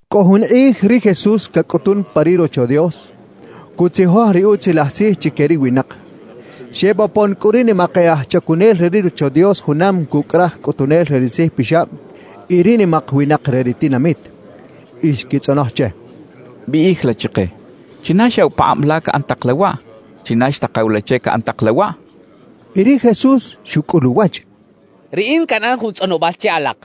Cꞌo jun kꞌij ri Jesús cacꞌutun pa ri Rocho Dios, cutzijoj ri Utzilaj Tzij chique ri winak. Xebopon cꞌu ri nimak e aj chacunel re ri Rocho Dios junam cucꞌ raj cꞌutunel re ri tzijpixab y ri nimak winak re ri tinamit, y xquitzꞌonoj che: —Biꞌij la chike: ¿China xyaꞌw pakꞌab la caꞌan tak la waꞌ? ¿China xtakaw la che caꞌan tak la waꞌ? —xechaꞌ. Y ri Jesús xucꞌul uwach: —Riꞌin canꞌan jun tzꞌonobal che alak;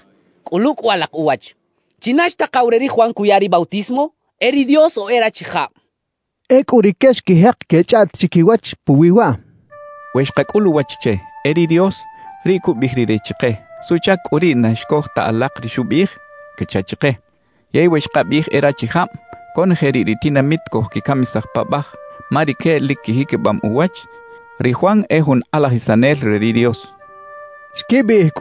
cꞌulu cꞌu alak uwach. ¿China xtakaw re ri Juan cuya ri bautismo? ¿E ri Dios o e rachijab? —xchaꞌ. Ecꞌu rique xquijek quechꞌaꞌt chiquiwach puwi waꞌ: «We xkacꞌul uwach che: “E ri Dios”, riꞌ cubiꞌij rire chike: “¿Suꞌchac cꞌu riꞌ na xcoj ta alak ri xubiꞌij?” cacha chike. Yey we xkabiꞌij “e rachijab”, conoje riꞌ ri tinamit cojquicamisaj paꞌbaj; ma rique lic quijiquibam uwach ri Juan e jun kꞌalajisanel re ri Dios» xecha chiquiwach.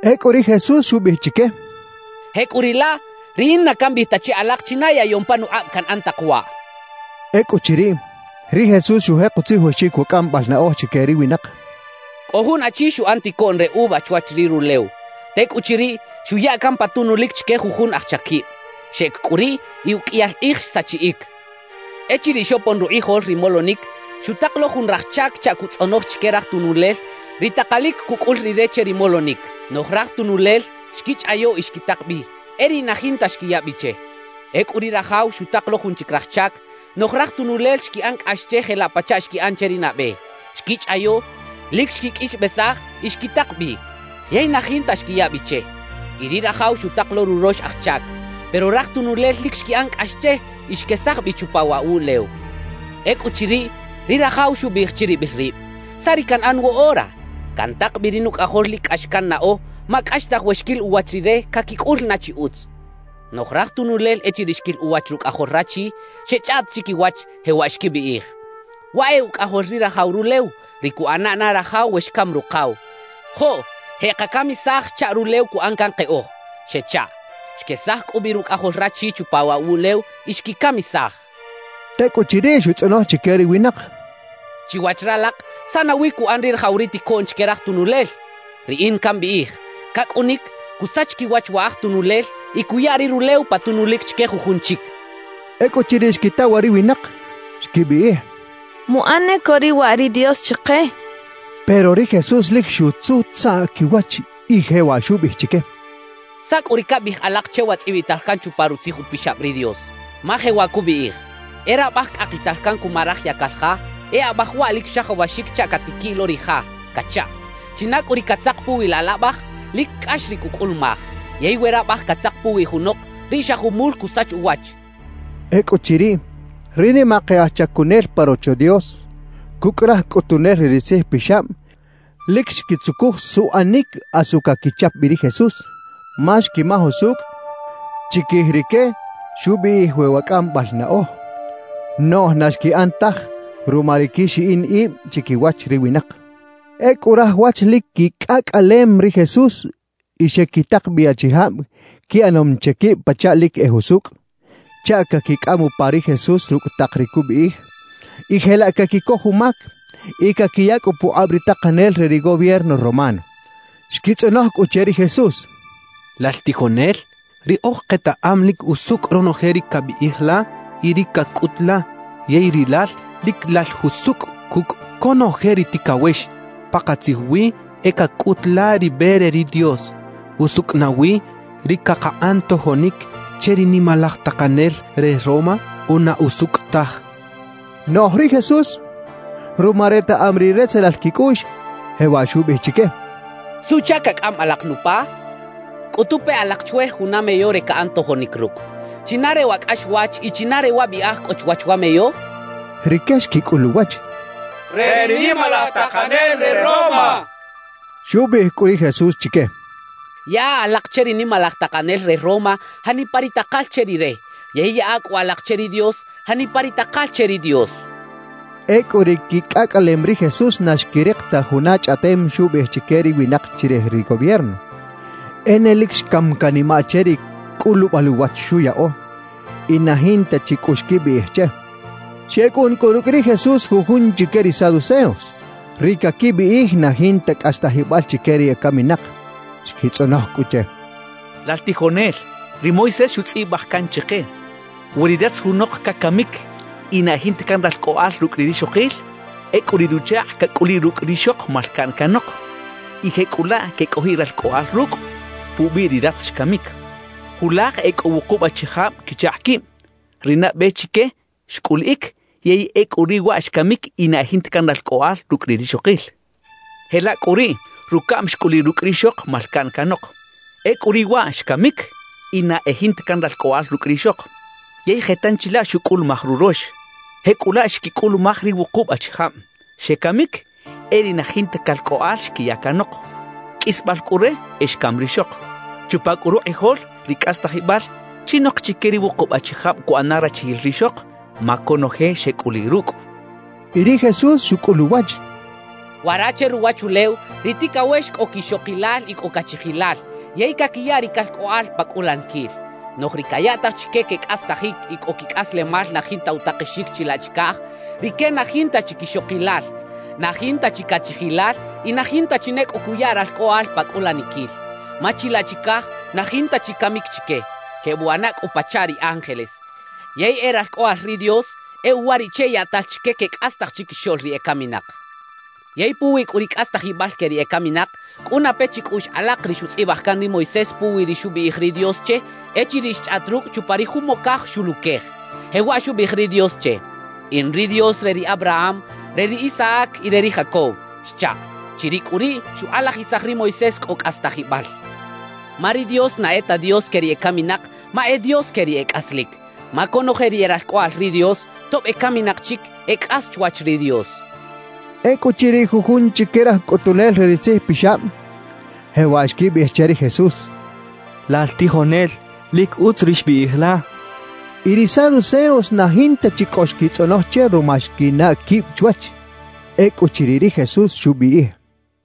Ecꞌu ri Jesús xubiꞌij chique: —Jecꞌuriꞌlaꞌ, riꞌin na cambiꞌij ta che alak china yaꞌyom panukꞌab canꞌan tak waꞌ —xchaꞌ. Ecꞌuchiriꞌ, ri Jesús xujek utzijoxic wa cꞌambal naꞌoj chique ri winak: «Cꞌo jun achi xuꞌan ticoꞌn re uva chwach ri rulew. Tecꞌuchiriꞌ, xuya can pa tunulic chique jujun aj chaquib. Xeꞌec cꞌu riꞌ y uqꞌuiyal kꞌij xsachiꞌic. »Echiriꞌ xopon rukꞌijol ri molonic, xutak lo jun raj chac chaꞌ cuꞌtzꞌonoj chique raj tunulel ri takalic cucꞌul rire che ri molonic. Noꞌj raj tunulel xquichꞌayo y xquitak bi; e riꞌ na jinta xquiya bi che. »Ecꞌu ri rajaw xutak lo jun chic raj chac. Noꞌj raj tunulel xquiꞌan cꞌax che jelaꞌ pachaꞌ xquiꞌan che ri nabe; xquichꞌayo, lic xquiqꞌuixbesaj y xquitak bi. Yey na jinta xquiya bi che. »Y ri rajaw xutak lo rurox aj chac. Pero raj tunulel lic xquiꞌan cꞌax che y xquesaj bi chupa waꞌ wuꞌlew. »Ecꞌuchiriꞌ, ri rajaw xubiꞌij chiribil rib: “¿Saꞌ ri canꞌan woꞌora? Cantak bi ri nucꞌajol lic cꞌax cannaꞌo; ma cꞌaxtaj we xquil uwach rire, caquicꞌul na chi utz.” »Noꞌj raj tunulel echiriꞌ xquil uwach rucꞌajol rachi, xechꞌaꞌt chiquiwach, jewaꞌ xquibiꞌij: “Waꞌ e ucꞌajol ri rajaw rulew, ri cuꞌana na rajaw we xcam rukaw. Joꞌ jeꞌkacamisaj chaꞌ rulew cuꞌan can keꞌoj” xechaꞌ. »Xquesaj cꞌu bi rucꞌajol rachi chupa waꞌ wuꞌlew y xquicamisaj» xcha ri Jesús. Tecꞌuchiriꞌ xutzꞌonoj chique ri winak: —Chiwach ralak, ¿saꞌ nawi cuꞌan ri rajaw ri ticoꞌn chique raj tunulel? Riꞌin cambiꞌij: Cacꞌunic, cusach quiwach wa aj tunulel y cuya ri rulew pa tunulic chique jujun chic —xchaꞌ. Ecꞌuchiriꞌ xquita waꞌ ri winak, xquibiꞌij: —¡Muꞌan ne co riꞌ waꞌ ri Dios chike! —xechaꞌ. Pero ri Jesús lic xutzutzaꞌ quiwach y jewaꞌ xubiꞌij chique: —¿Saꞌ cꞌu ri cabiꞌij alak che wa tzꞌibital can chupa Rutzij Upixab ri Dios? Ma jewaꞌ cubiꞌij: E rabaj cꞌakital can cuma raj yacal ja, e abaj waꞌ lic xajawaxic chaꞌ catiquiꞌ lo ri ja cachaꞌ. China cꞌu ri catzak puwi laꞌ laꞌbaj, lic cꞌax ri cucꞌulumaj; yey we rabaj catzak puwi junok, riꞌ xa jumul cusach uwach —xchaꞌ. Ecꞌuchiriꞌ, ri nimak e aj chacunel pa Rocho Dios cucꞌ raj cꞌutunel re ri tzijpixab lic xquitzucuj suꞌanic asu caquichap bi ri Jesús, ma xquimaj usucꞌ chiquij rique xubiꞌij wi wa cꞌambal naꞌoj; noꞌj na xquiꞌan taj ruma ri quixiꞌin ib chiquiwach ri winak. Ecꞌu raj wach lic quicꞌacꞌalem ri Jesús y xequitak bi achijab quiꞌanom che quib pachaꞌ lic e jusucꞌ, chaꞌ caquicꞌam upa ri Jesús rucꞌ tak ri cubiꞌij y jelaꞌ caquicoj umac y caquiya cꞌu pukꞌab ri takanel re ri gobierno romano. Xquitzꞌonoj cꞌu che ri Jesús: —Lal tijonel, riꞌoj ketaꞌam lic usucꞌ ronoje ri cabiꞌij la y ri cacꞌut la, yey rilal lic lal jusucꞌ cucꞌ conoje ri ticawex. Pakatzij wi e cacꞌut la ri be re ri Dios. ¿Usucꞌ nawi ri cakaꞌan tojonic che ri nimalaj takanel re Roma o na usucꞌ taj? —xechaꞌ. Noꞌj ri Jesús, ruma retaꞌam ri retzelal quicꞌuꞌx, jewaꞌ xubiꞌij chique: —¿Suꞌchac cacꞌam alak nupa? Cꞌutu pe alak chwe juna meyo re caꞌan tojonic rucꞌ. ¿China re wa cꞌaxwach y china re wa biꞌaj cꞌo chwach wa meyo? —xchaꞌ. Rique xquicꞌul uwach: —Re ri nimalaj takanel re Roma —xechaꞌ. Xubiꞌij cꞌu ri Jesús chique: —Yaꞌa alak che ri nimalaj takanel re Roma janipa ri takal che rire; yey yaꞌa cꞌu alak che ri Dios janipa ri takal che ri Dios —xchaꞌ. Ecꞌu ri quicꞌacꞌalem ri Jesús na xquirik ta juna chꞌaꞌtem xubiꞌij chique ri winak chirij ri gobierno. E ne lic xcam canimaꞌ che ri cꞌulubal uwach xuyaꞌo y na jinta chi cꞌu xquibiꞌij che. Xecꞌun cꞌu rucꞌ ri Jesús jujun chique ri saduceos, ri caquibiꞌij na jinta cꞌastajibal chique ri ecaminak. Xquitzꞌonoj cꞌu che: —Lal tijonel, ri Moisés xutzꞌibaj can chike: “We ri ratz junok cacamic y na e jinta can ralcꞌoꞌal rucꞌ ri rixokil, ecꞌu riꞌ ruchakꞌ cacꞌuliꞌ rucꞌ rixok malcaꞌn canok y jecꞌulaꞌ quecꞌojiꞌ ralcꞌoꞌal rucꞌ, pubiꞌ ri ratz xcamic”. »Julaj e cꞌo wukub achijab quichakꞌ quib. Ri nabe chique xcꞌuliꞌic, yey ecꞌu riꞌ waꞌ xcamic y na e jinta can ralcꞌoꞌal rucꞌ ri rixokil. Jelaꞌ cꞌu riꞌ rucaꞌm xcꞌuliꞌ rucꞌ rixok malcaꞌn canok. Ecꞌu riꞌ waꞌ xcamic y na e jinta can ralcꞌoꞌal rucꞌ rixok. Yey je tanchi laꞌ xucꞌulumaj rurox. Jecꞌulaꞌ xquicꞌulumaj ri wukub achijab; xecamic, e riꞌ na jinta calcꞌoꞌal xquiya canok. Qꞌuisbal cꞌu re, e xcam rixok. Chupa cꞌu rukꞌijol ri cꞌastajibal, ¿chinok chique ri wukub achijab cuꞌana rachijil rixok? Ma conoje xecꞌuliꞌ rucꞌ —xechaꞌ. Y ri Jesús xucꞌul uwach: —Wara che ruwachulew ri ticawex cꞌo quixokilal y cꞌo cachijilal yey caquiya ri calcꞌoꞌal pa cꞌulaniquil. Noꞌj ri cayaꞌtaj chique quecꞌastajic y cꞌo quicꞌaslemal na jinta utakexic chilaꞌ chicaj, rique na jinta chi quixokilal, na jinta chi cachijilal y na jinta chi ne cꞌo cuya ralcꞌoꞌal pa cꞌulaniquil. Ma chilaꞌ chicaj na jinta chi camic chique, quebuꞌana cꞌu pachaꞌ ri ángeles. Yey e ralcꞌoꞌal ri Dios; e uwariꞌche yaꞌtal chique quecꞌastaj chiquixoꞌl ri ecaminak. Yey puwi cꞌu ri cꞌastajibal que ri ecaminak, cꞌuna pe chicꞌuꞌx alak ri xutzꞌibaj can ri Moisés puwi ri xubiꞌij ri Dios che echiriꞌ xchꞌaꞌt rucꞌ chupa ri jumocaj xuluquej, jewaꞌ xubiꞌij ri Dios che: “In ri Dios re ri Abraham, re ri Isaac y re ri Jacob” xchaꞌ. Chiriꞌ cꞌu riꞌ xukꞌalajisaj ri Moisés cꞌo cꞌastajibal, ma ri Dios na e ta Dios que ri ecaminak ma e Dios que ri e cꞌaslic. Ma conoje ri e ralcꞌoꞌal ri Dios, tob ecaminak chic, e cꞌas chwach ri Dios —xchaꞌ. Ecꞌuchiriꞌ jujun chique raj cꞌutunel re ri tzijpixab, jewaꞌ xquibiꞌij che ri Jesús: —Lal tijonel, lic utz ri xbiꞌij la —xechaꞌ. Y ri Saduceos na jinta chi cꞌo xquitzꞌonoj che ruma xquinaꞌ quib chwach. Ecꞌuchiriꞌ ri Jesús xubiꞌij: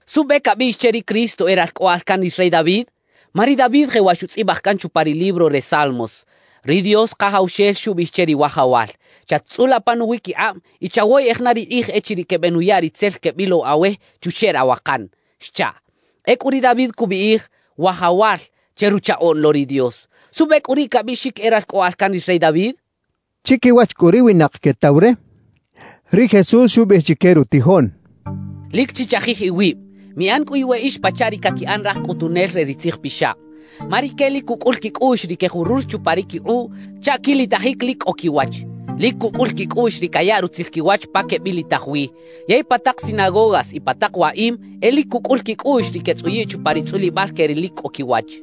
«¿Suꞌbe cabiꞌx che ri Cristo e “Ralcꞌoꞌal can ri rey David”? Ma ri David jewaꞌ xutzꞌibaj can chupa ri libro re Salmos: Ri Dios Kajawxel xubiꞌij che ri Wajawal: “Chat-tzꞌula pa nuwiquikꞌab, y chawoyeꞌej na ri kꞌij echiriꞌ quebenuya ri tzel quebilow awe chuxeꞌ rawakan” xchaꞌ. Ecꞌu ri David cubiꞌij “Wajawal” che Ruchaꞌoꞌn lo ri Dios. ¿Suꞌbe cꞌu riꞌ cabiꞌxic e Ralcꞌoꞌal can ri rey David?» xchaꞌ. Chiquiwach cꞌu ri winak quetaw re, ri Jesús xubiꞌij chique rutijoꞌn: «Lic chichajij iwib; miꞌan cꞌu iweꞌix pachaꞌ ri caquiꞌan raj cꞌutunel re ri tzijpixab. Ma rique lic cucꞌul quicꞌuꞌx ri quejurur chupa ri quikꞌuꞌ chaꞌ quilitajic lic cꞌo quiwach. Lic cucꞌul quicꞌuꞌx ri cayaꞌ rutzil quiwach pa quebilitaj wi. Yey pa tak sinagogas y pa tak waꞌim e lic cucꞌul quicꞌuꞌx ri quetzꞌuyiꞌ chupa ri tzꞌulibal que ri lic cꞌo quiwach.